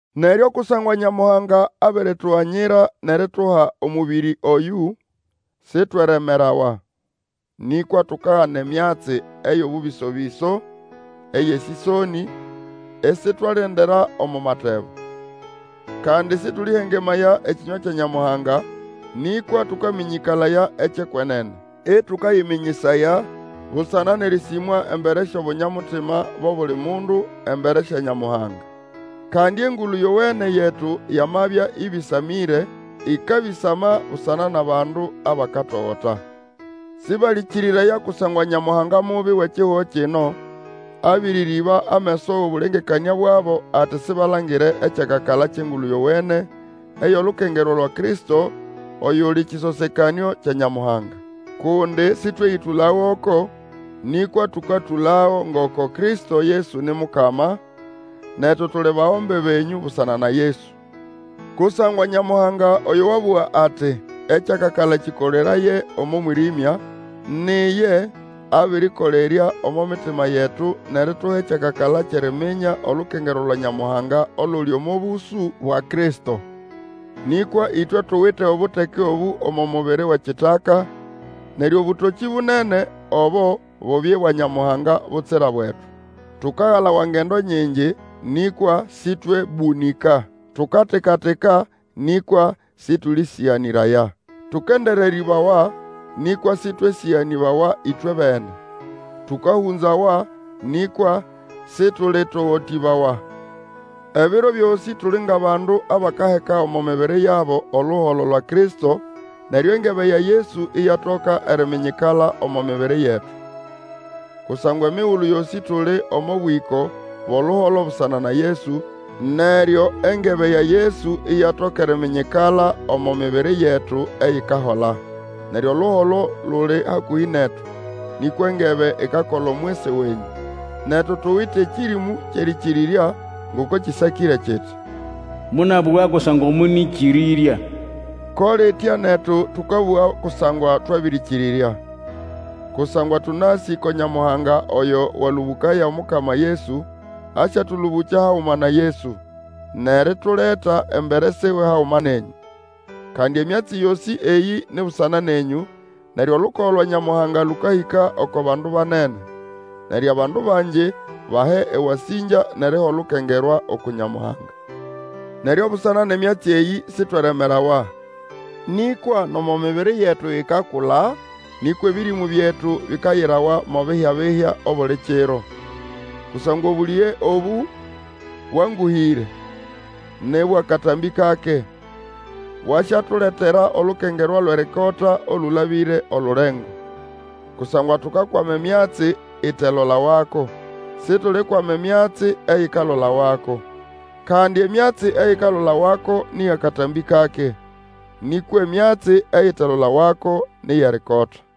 Neryo kusangwa Nyamuhanga abirituganyira nʼerituha omũbĩrĩ oyũ, sitweremerawa. Nĩkwa tukagana emyatsi eyo bũbĩso-bĩso eyʼesĩsonĩ, isitwalendera omo matebo. Kandi sĩtũlĩhengemaya ekĩnywa kya Nyamuhanga, nĩkwa tũkamĩnyĩkalaya ekyʼekwenene, ĩtũkayĩmĩnyĩsaya busana nʼerĩsĩmwa embere syʼobunyamutima bʼobuli mundu, embere sya Nyamuhanga. Kandi Engulu Yowene yetu yamabya ĩbĩsamĩre, ĩkabĩsama busana nʼabandu abakatogota. Sĩbalĩkĩrĩraya kusangwa nyamuhanga mubi wʼekihugo kino abĩrĩrĩba ameso wʼobũlengekanĩa bwabo ati sibalangire ekyakakala kyʼEngulu Yowene eyʼolukengerwa lwa Kristo, oyuli kĩsosekanĩo kya Nyamuhanga. Kundi sĩtweyĩtũla goko, nĩkwa tũkatũlago ngoko Kristo Yesu ni Mukama, netu tuli bagombe benyũ busana na Yesu. Kusangwa Nyamuhanga oyo wabũga ati, Ekyakakala kĩkoleraye omo mwĩrĩmya, ni iye abĩrĩkolerya omo mitima yetu nʼerituha ekyakakala kyʼeriminya olukengerwa lwa Nyamuhanga oluli omo bũsũ bwa Kristo. Nĩkwa ĩtwe tuwite obuteke obũ omo mubiri wʼekitaka, neryo obũtokĩ bunene obo bubye bwa Nyamuhanga butsira bwetu. Tukagalawa ngendo nyingi, nĩkwa sĩtwebũnĩka; tukatika-tika, nĩkwa sĩtũlĩsĩganĩraya. Tũkendererĩbawa, nĩkwa sĩtwesĩganĩbawa ĩtwebene; tũkahũnzawa, nĩkwa sĩtũlĩtogotĩbawa. Ebiro byosĩ tuli ngʼabandu abakaheka omo mibiri yabo oluholo lwa Kristo, neryo engebe ya Yesu iyatoka eriminyikala omo mibiri yetu. Kusangwa emigulu yosĩ tuli omo bwĩko bwʼoluholo busana na Yesu, neryo engebe ya Yesu iyatoka eriminyikala omo mibiri yetu eyikahola. Neryo oluholo luli hakũhĩ netu, nĩkwa engebe ikakola omwisi wenyũ. Netu tuwite ekĩrĩmũ kyʼerĩkĩrĩrya, ngoko kĩsakĩre kiti, Monabũga kusangwa monĩkĩrĩrya. Ko litya netu tũkabũga kusangwa twabĩrĩkĩrĩrya; kusangwa tũnasĩ ko Nyamuhanga oyo walũbũkaya Omukama Yesu, asyatũlũbũkya haguma na Yesu, nʼerituleta embere siwe haguma nenyũ. Kandi emyatsi yosĩ eyĩ ni busana nenyũ, neryo olukogo lwa Nyamuhanga lũkahĩka oko bandu banene. Neryo abandu bangi bahe ewasĩngya nʼeriha olukengerwa uku Nyamuhanga. Neryo busana nʼemyatsi eyĩ sitweremerawa. Nĩkwa nomo mibiri yetu ikakula, nĩkwa ebĩrĩmũ byetu bikayirawa mo bihya-bihya obuli kiro. Kusangwa obũlĩge obũ bwangũhĩre, nĩ bwʼakatambĩ kake, bwasyatuletera olukengerwa lwʼerikota, olũlabĩre olulengo. Kusangwa tukakwama emyatsi itelolawako. Situlikwama emyatsi eyikalolawako. Kandi emyatsi eyikalolawako nĩ yʼakatambĩ kake, nĩkwa emyatsi eyitelolawako ni yʼerikota.